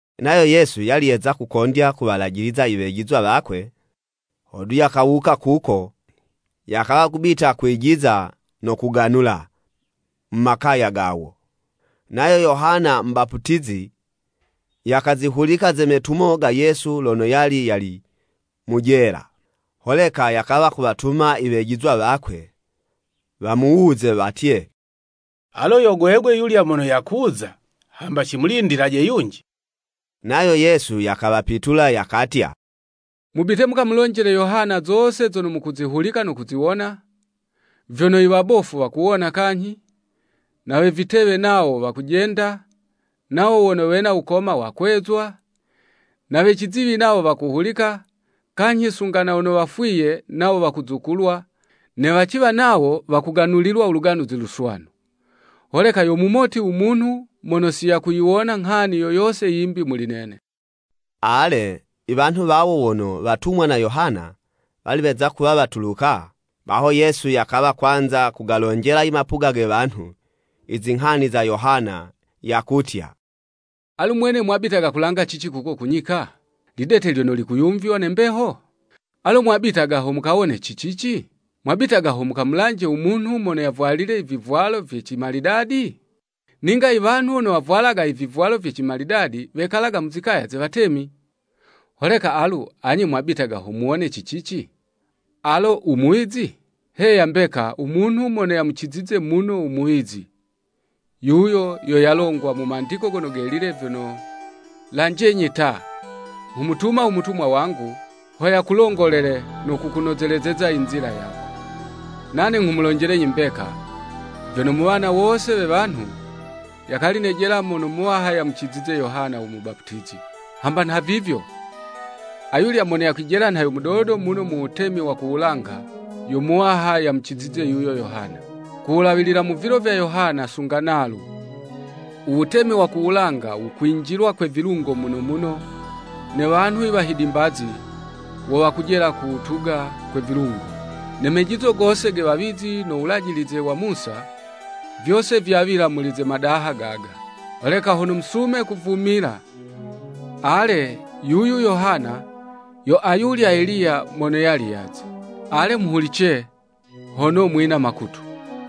Nayo Yesu yali yeza kukondya kuwalajiliza i wejizwa wakwe, hodu yakawuka kuko, yakawa kubita kwijiza no kuganula, mu makaya gawo. Nayo Yohana mubaputizi, yakazihulika ze metumo ga Yesu lono yali yali mu jela. Holeka yakawa kuwatuma i wejizwa wakwe, wamuwuze watye, “Alo yo gwegwe yulya mono yakuza, hamba cimulindilaje yunji?” Nayo Yesu yakawapitula yakatya, “Mubite mukamulonjele Yohana zose zono mukuzihulika no kuziwona, vyono i wabofu wakuwona kanyhi, we vitewe nawo, wakujenda, nawo wono wena wukoma, wakwezwa, na we ciziwi nawo wakuhulika, kanyhi sunga na wono wafwiye, nawo wakuzukulwa, ne waciwa nawo wakuganulilwa u Luganuzi Luswanu. Holeka, yo mumoti u munhu mono si yakuyiwona nghani yo yose yimbi muli nene.” Ale, i wanhu wawo wono watumwa na Yohana, wali weza kuwa watuluka, baho Yesu yakawa kwanza kugalonjela i mapuga ge wanhu, i zinghani za Yohana, yakutya, “Alu mwene mwabitaga kulanga cici kuko ku nyika? Lidete lyono likuyumvywa ne mbeho? Alo mwabitaga ho mukawone ci cici? Mwabitaga ho mukamulanje u munhu mono yavwalile i vivwalo vye cimalidadi? Ninga i wanhu wono wavwalaga i vivwalo vye cimalidadi wekalaga mu zikaya ze watemi. Holeka alu anye mwabitaga ho muwone ci cici? Alo u Muwizi?” Heya mbeka u munhu mono yamucizize muno u muwizi. “Yuyu yo yalongwa mu Mandiko Gono Gelile vyono, Lanjenyi ta, nghumutuma u mutumwa wangu, ho yakulongolele no kukunozelezeza i nzila yako.” Nane nghumulonjelenyi mbeka, vyono mu wana wose we wanhu, yakali nejela mono muwaha yamucizize Yohana Mubaputizi. Hamba nhavivyo, ayulya mono yakwijela nha yo mudodo muno mu wutemi wa ku wulanga, yo muwaha yamucizize yuyo Yohana. Kuwulawilila mu vilo vya Yohana sunga nalu, u Wutemi wa ku wulanga wukwinjilwa kwe vilungo muno muno, ne wanhu i wahidimbazi, wo wakujela kuwutuga kwe vilungo. Ne mejizo gose ge wawizi no Wulajilize wa Musa, vyose vyawila muli ze madaha gaga. Holeka hono musume kuvumila, ale, yuyu Yohana yo ayulya Eliya mono yali yaze. Ale muhulice, hono mwina makutu!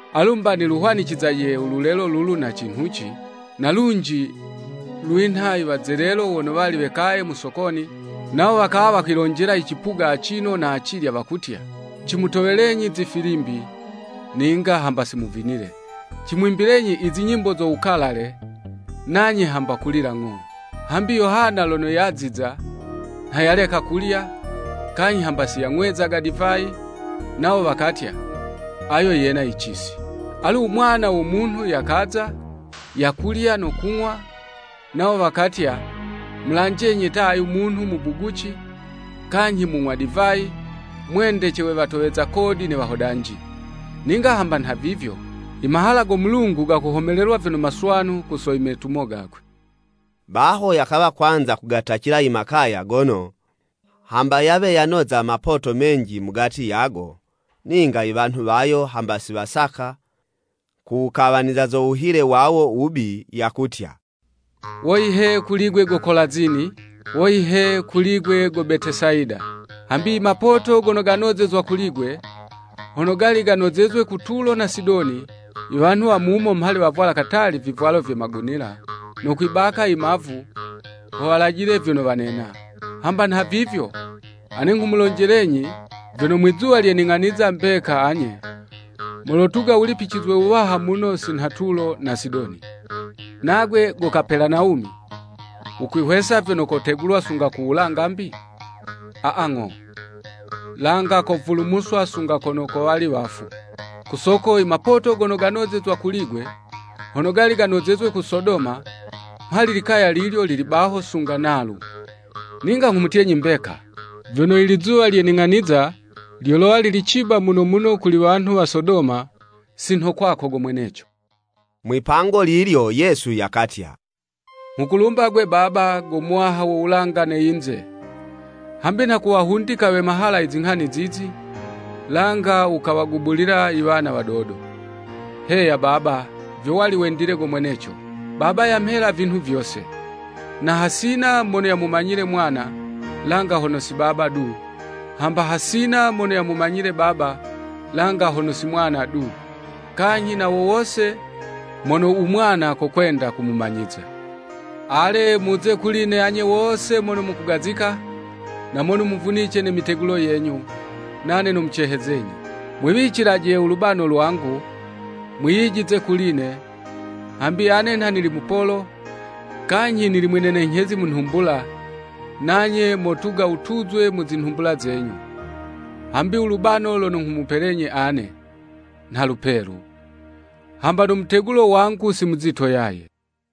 “Alu 'mba niluhwanicizaje u lulelo lulu na cinhuci? Na lunji lwinha i wazelelo wono wali wekaye mu sokoni, nawo wakawa wakwilonjela i cipuga acino na acilya, wakutya, Cimutowelenyi zifilimbi, ninga hamba si muvinile, cimwimbilenyi i zinyimbo zo wukalale, nanye hamba kulila ng'o!” Hambi Yohana lono yaziza, nha yaleka kulya, kanyhi hamba si yang'wezaga divayi, nawo wakatya, “Ayo yena yicisi.” Alu, u Mwana wo Munhu yakaza, yakulya no kung'wa, nawo wakatya, “Mulanjenyi ta ayu munhu mubuguci, kanyhi mung'wa divayi, mwendece we watoweza kodi ne wahodanji. Ninga hamba nhavivyo, i mahala go Mulungu gakuhomelelwa vyono maswanu ku so i metumo gakwe.” Baho yakawa kwanza kugatacila i makaya gono, hamba yawe yanoza mapoto menji mugati yago, ninga iwanhu wayo hamba si wasaka kuwukawaniza zo wuhile wawo wubi, yakutya, “Woyi he, kuli'gwe go Kolazini, woyi he, kuli'gwe, go Betesayida. Hambi i mapoto gono ganozezwa kuli'gwe, hono gali ganozezwe ku Tulo na Sidoni, iwanhu wa mumo mhali wavwala katali vivwalo vye magunila, no kwibaka i mavu, ho walajile vyono wanena. Hamba nhavivyo ane nghumulonjelenyi vyono, Mwizuwa lye ning'aniza mbeka anye, molotuga wulipicizwe wuwaha muno si nha Tulo na Sidoni. Nagwe go Kapelanawumi, wukwihwesa vyono kotegulwa sunga ku wulanga mbi? Aa, ng'o, langa kovulumuswa sunga kono kowali wafu! Ku soko i mapoto gono ganozezwa kuli'gwe, hono gali ganozezwe ku Sodoma, mhali likaya lilyo lili baho sunga nalu. Ninga nghumutyenyi mbeka, vyono i lizuwa lye ning'aniza lyolowa lili ciba muno muno kuli wanhu wa Sodoma si nho kwako go mweneco.” Mwipango lilyo Yesu yakatya, “Nghukulumba 'gwe Baba, go Muwaha wo wulanga ne yinze, hambi nha kuwahundika we mahala i zinghani zizi, langa wukawagubulila i wana wadodo. Heya, Baba, vyo wali wendile go mweneco. “Baba yamhela vinhu vyose. Na hasina mono yamumanyile Mwana, langa hono si Baba du, hamba hasina mono yamumanyile Baba, langa hono si Mwana du, kanyhi na wo wose mono u Mwana kokwenda kumumanyiza. Ale, muze kuli'ne anye wose mono mukugazika, na mono muvunice ne mitegulo yenyu, nane nomucehezenyi. Mwiwicilaje u lubano lwangu, mwiyijize kuli'ne, hambi ane nha nili mupolo, kanyhi nili mwinenenyhezi mu nhumbula, nanye motuga wutuzwe mu zinhumbula zenyu. Hambi u lubano lono nghumupelenyi ane, nha lupelu, hamba no mutegulo wangu si muzito yaye.”